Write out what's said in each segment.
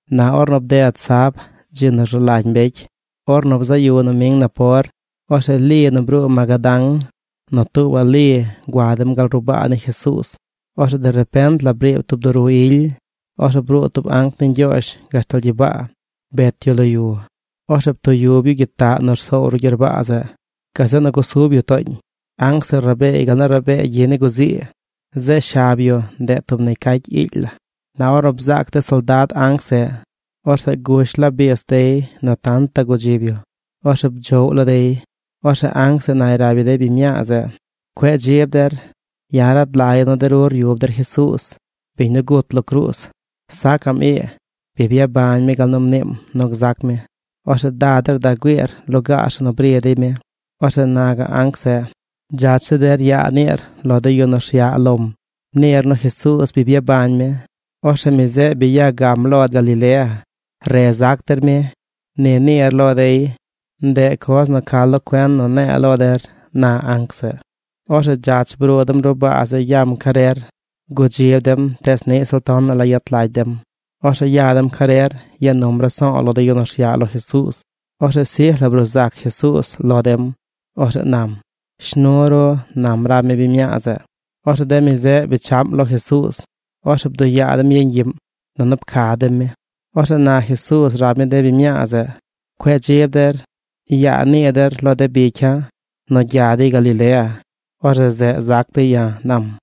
Na or bded sab, dzi nu rzu lagy mbecy, ornu bzaꞌ yu noming napor, orzeꞌ Li nu bruu Magadán, nu tuubaꞌ Li gua dem gal ruꞌ baa ni Jesuuz. Orzeꞌ de repent la briib tub duru ily. Orzeꞌ bruu tub anc ni Ñgyoozh gashtal gyibaa. Bet yu lo yu. Orzeꞌ ptuyub yu gyitaꞌ nu rsoow ruꞌ gyerbaa zeꞌ. Gazeꞌ nu gusub yu tooñ. Anc zeꞌ rabeey gal nu rabee gyi ni guzii. Zeꞌ shab yu, ndeꞌ tub negy cacy iily laa. Na ornu bzaac de soldad anc zeꞌ, orzeꞌ gush la bis dey nu tantaꞌ gudzib yu. Orzeꞌ bdzoꞌw la dey. Orzeꞌ anc zeꞌ nay rab yu de biñ mñaa zeꞌ: ―Cueꞌ dzib der. Ya̱ rad lagya̱ nu de ru ryub der Jesuuz, biñ nu gut lo cruuz. Sacaꞌm ii. Bi byabañ mi gal nu mniim nu gzac mi. Orzeꞌ da der da güiir lugaar zeꞌ nu bri dey mi. Orzeꞌ na gaꞌ anc zeꞌ: ―Dzach zi der yaa niir lo de yu nu rsyaꞌ lom. Niir nu Jesuuz bi byabañ mi. Orzeꞌ mi zeꞌ bi ya gam lo der par Galilea. Re zac der mi. Ni niir lo dey. Ndeꞌ coz nu ca lo cuen nu ne̱e̱ lo der ―na anc zeꞌ. Orzeꞌ dzach bruu dem ruꞌ baa zeꞌ yam carer. Gudzib dem tees niꞌ ziꞌl tonaꞌ la yet lagy dem. Orzeꞌ ya dem carer ya num raso̱o̱ lo de yu nu rsyaꞌ lo Jesuuz. Orzeꞌ sij la bruu zac Jesuuz lo dem. Orzeꞌ nam: ―Shnu ru ―nam rab mi biñ mñaa zeꞌ. Orzeꞌ de mi zeꞌ bechaꞌm lo Jesuuz. Orzeꞌ bduyaa dem yeñ gyiꞌm nunu pca dem mi. Orzeꞌ na Jesuuz rab mi de biñ mñaa zeꞌ: ―Cueꞌ dzib der. Yaa nii der lo de bicya̱ nu gya dey Galilea. Orzeꞌ zeꞌ zac dey ya̱ ―nam.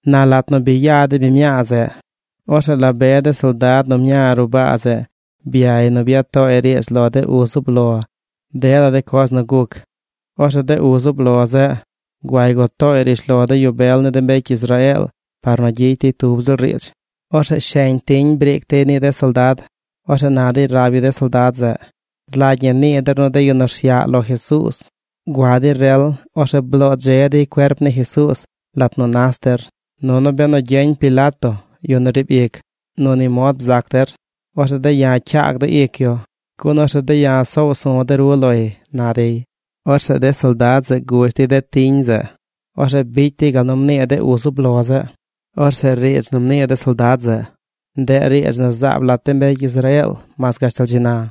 Na lat nu bi ya de biñ mñaa zeꞌ, orzeꞌ la be de soldad nu mña ruꞌ baa zeꞌ byay nu bya tooy riidz lo de uz zub lo dela de coz nu guc. Orzeꞌ de uz zub lo zeꞌ guay gua tooy rishlo de yu bel ni de mbecy Israeel par nu gyicy dey tub ziꞌl riidz. Orzeꞌ sheñ tiñ briic dey ni de soldad. Orzeꞌ na dey rab yu de soldad zeꞌ: ―Rlagy ñi nii der nu de yu nu rsyaꞌ lo Jesuuz, gua dey rel, orzeꞌ bloo dze dey cuerp ni Jesuuz lat nu nas der. Nunu benu gyeñ Pilato, yu nu riib ic, nu ni mod bzac der, orzeꞌ de̱ ya̱ cyaag de̱ ic yu, gun orzeꞌ de̱ ya̱ soow su̱ de ru loy ―na dey. Orzeꞌ de soldad zeꞌ gush dey de tiñ zeꞌ. Orzeꞌ bicy dey gal nu mnii de uz zub lo zeꞌ. Orzeꞌ riidz nu mnii de soldad zeꞌ, ndeꞌ riidz nu zaab lat de mbecy Israeel mas gashtal dzi na.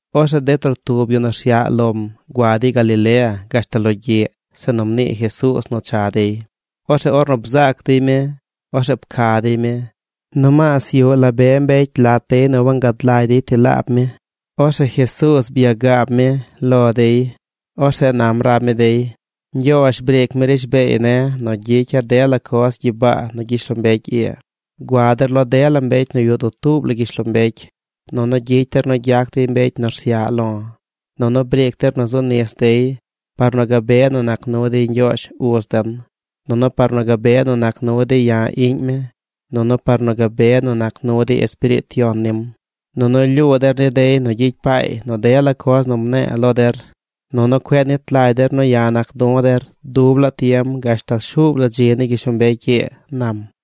Orzeꞌ de trotub yu nu rsyaꞌ lom gua dey Galilea gashtal logyiꞌ zeꞌ nu mnii Jesuuz nu cha dey. Orzeꞌ ornu bzaac dey mi, orzeꞌ pca dey mi. Nomaas yuꞌ la be mbecy lat dey nu wangad lagy dey ti laab mi. Orzeꞌ Jesuuz byagaab mi lo dey. Orzeꞌ nam rab mi dey: ―Ñgyoozh briic mi rishbeey ne̱ nu gyicya̱ dela coz gyibaa nu gyishlombecy ii. Gua der lo dela mbecy nu yuꞌ dutuub la gyishlombecy, nunu gyicy der nu gyac dey mbecy nu rsyaꞌ lo̱. Nunu briic der nu zu nis dey par nu gabe nu nac nu dey Ñgyoozh uz den, nunu par nu gabe nu nac nu dey ya̱ iꞌñ mi, nunu par nu gabe nu nac nu dey Espiriit Yon nim. Nunu lyuu der ni dey nu gyicy paay nu dela coz nu mne̱e̱ lo der. Nunu cueꞌ nit lagy der nu ya̱ nac du̱ der dub laa tiem gashtal shuub la dzi ni gyishlombecy ii ―nam.